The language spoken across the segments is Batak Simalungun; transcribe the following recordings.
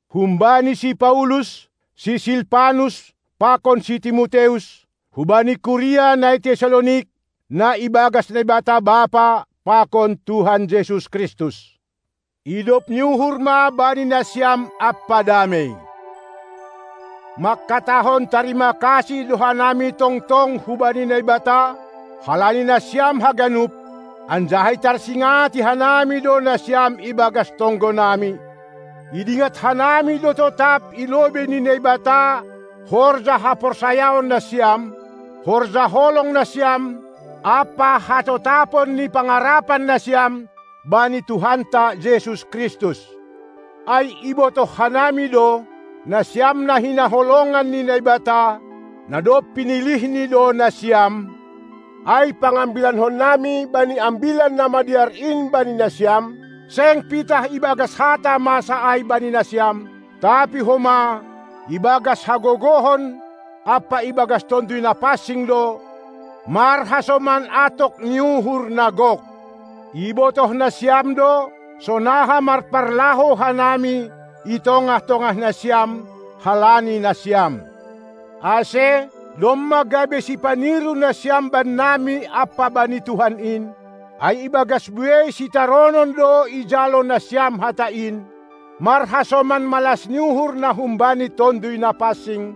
Humbani si Paulus, si Silpanus pakon si Timoteus, hubani kuria na i Tessalonik, na ibagas Naibata Bapa pakon Tuhan Jesus Kristus: Idop ni uhur ma bani nasiam ampa damei! Mangkatahon tarima kasih do hanami tongtong hubani Naibata halani nasiam haganup, anjaha itarsingati hanami do nasiam ibagas tonggonami. Idingat hanami do totap i lobei ni Naibata horja haporsayaon nasiam, horja holong nasiam ampa hatotapon ni pangarapan nasiam bani Tuhanta Jesus Kristus. Ai ibotoh hanami do, nasiam na hinaholongan ni Naibata, na dob pinilihNi do nasiam, ai pangambilankonnami bani Ambilan Namadear in bani nasiam seng pitah ibagas hata masa ai bani nasiam, tapi homa ibagas hagogohon ampa ibagas Tonduy Napansing do, marhasoman atok ni uhur na gok. Ibotoh nasiam do, sonaha marparlahou hanami i tongah-tongah nasiam, halani nasiam. Ase domma gabe sipaniru nasiam bannami ampa bani Tuhan in, ai ibagas buei sitaronon do ijalo nasiam hata in, marhasoman malas ni uhur na humbani Tonduy Napansing,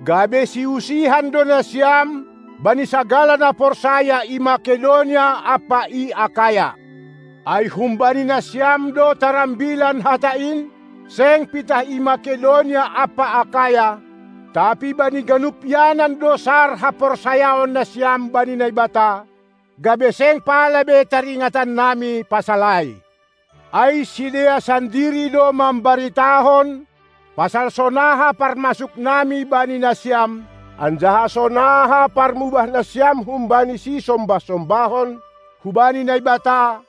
gabe siusihan do nasiam bani sagala na porsaya i Makedonia ampa i Akaya. Ai humbani nasiam do tarambilan hata in, seng pitah i Makedonia ampa Akaya, tapi bani ganup ianan do sar haporsayaon nasiam bani Naibata, gabe seng pala be taringatannami pasal ai. Ai sidea sandiri do mambaritahon pasal sonaha parmasuknami bani nasiam, anjaha sonaha parmubah nasiam humbani sisombah-sombahon hubani Naibata,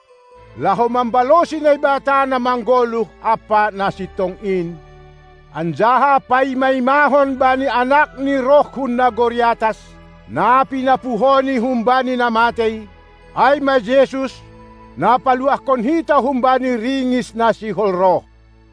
laho mambalosi Naibata Namanggoluh ampa Nasintong in, anjaha paima-imahon bani AnakNi roh hun nagori atas, na pinapuhoNi humbani na matei, ai ma Jesus, na paluahkon hita humbani ringis na sihol roh.